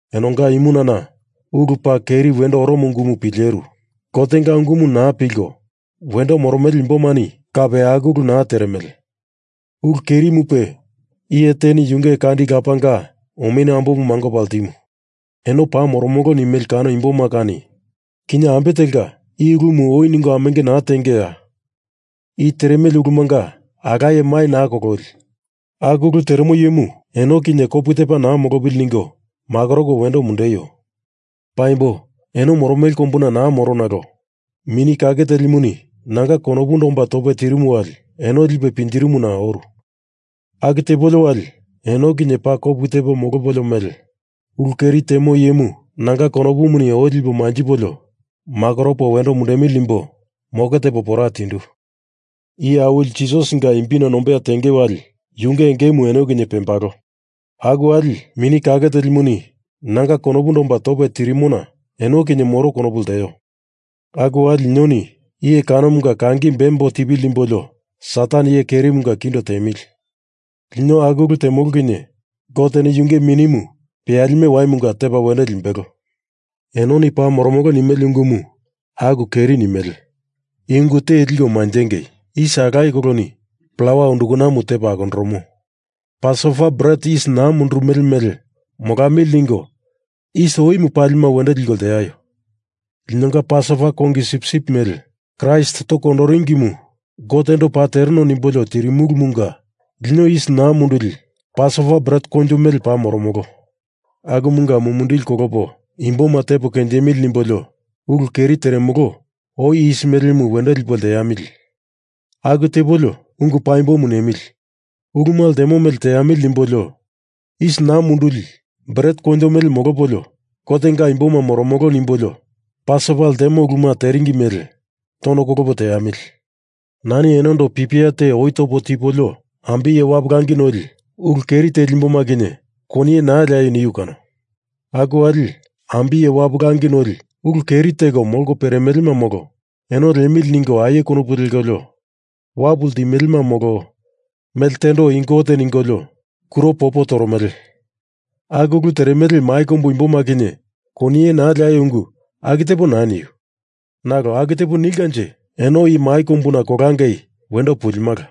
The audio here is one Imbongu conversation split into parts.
Enonga imunana ulu paa keri wendo oromo ungumu pileru. Gotenga ungumu naa pilko wendo moromele imbomani kape aku ulu naa teremele. Ulu kerimupe iye teni yunge kandi lapanga omenu ambomu mangopa ltimu. Eno paa moromolo nimele kano imboma kani kinye ambe telka i ulumu oi ningo amenge naa tengeya? I teremele ulumunga alaye mai naa kololi. Aku ulu teremo iyemu eno kinye kopu tepa naa molopili ningo makoroko wendo mundeio! Paimbo eno moromele kombuna naa moro nalo Mini Kake Telimuni nanga konopundo omba tope tirimu wali eno lipe pinjirimuna oru. Aku tepo molopolio wali eno kinye paa kopu tepo molopolio mele ulu keri temo iyemu nanga konopumuni oi lipo manjipolio makoropo wendo mundemili nimbo moke tepo pora tindu. Iye Awili Jisasinga imbina nombeya tenge wali yunge engemu eno kinye pembalo. Aku wali Mini Kake Telimuni nanga konopundo omba tope tirimona eno kinye moro konopu lteo. Aku wali linoni iye kanomunga kangi bembo tipili nimbolio Satan iye kerimunga kindo tiemili. Lino aku ulu temolo kinye Goteni yunge minimu peyalime waimunga tepa wendo limbelo. Enoni paa moromolo nimele ungumu aku keri nimele. I ungu te liko manjengei. Yis alaye koloni plawa undukanamu tepa akondoromo. Pasova bret yis naa mundurumele mele molamili ningo yis oimu pali wendo liko lteaio. Linonga Pasova kongi sipsip mele Kraist toko kondoringimu Gotendo paa tereno nimbolio tirimulumunga lino yis naa munduli Pasova bret koinjo mele paa moromolo. Akumunga mumindili kolopo imboma tepo kenjemili nimbolio ulu keri teremolo oi yis melemu wendo lipo lteamili. Aku tepolio ungu paimbomu nemili, uluma ltemo mele teamili nimbolio yis naa munduli bret koinjo mele molopolio Gotenga imboma moromolo nimbolio Pasova ltemo uluma teringi mele tono kolopo teamili. Nani enondo pipia te oi topo tipolio ambiye wapu langi noli ulu keri teli imboma kinye koniye naa leaio niu kano. Aku wali ambiye wapu langi noli ulu keri teko molko peremelema molo eno liemili ningo aie konopu lekolio wapu ltimelema molo mele tendo i gote ningolio kuro popo toromele aku ulu teremele mai kombu imboma kinye koniye naa leaio ungu aku tepo naa niu. Nalo aku tepa nilkanje, eno i mai kombuna kolangei wendo pulimala.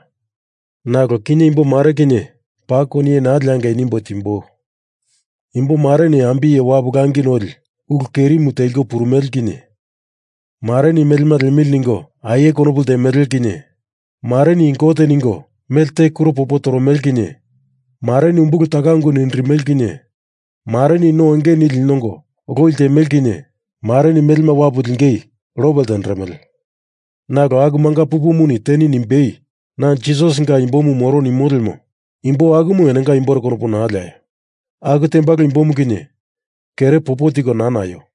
Nalo kinye imbomare kinye paa koniye naa leangei nimbo timboi. Imbomareni ambiye wapu langi noli ulu kerimu teliko purumele kinye mareni melema liemili ningo aie konopu ltemele kinye mareni i gote ningo melte kuro popo toromele kinye mareni umbulu taka ungu nindirimele kinye mareni no enge nili nongo loi ltemele kinye mareni melema wapu lingei lope ltenderemele. Nalo aku manga pupumuni teni nimbei na Jisasinga imbomu moro nimo lemo imbo akumu enonga imbore konopu naa leaio. Aku tembalo imbomu kinye kere popo tiko naa naio.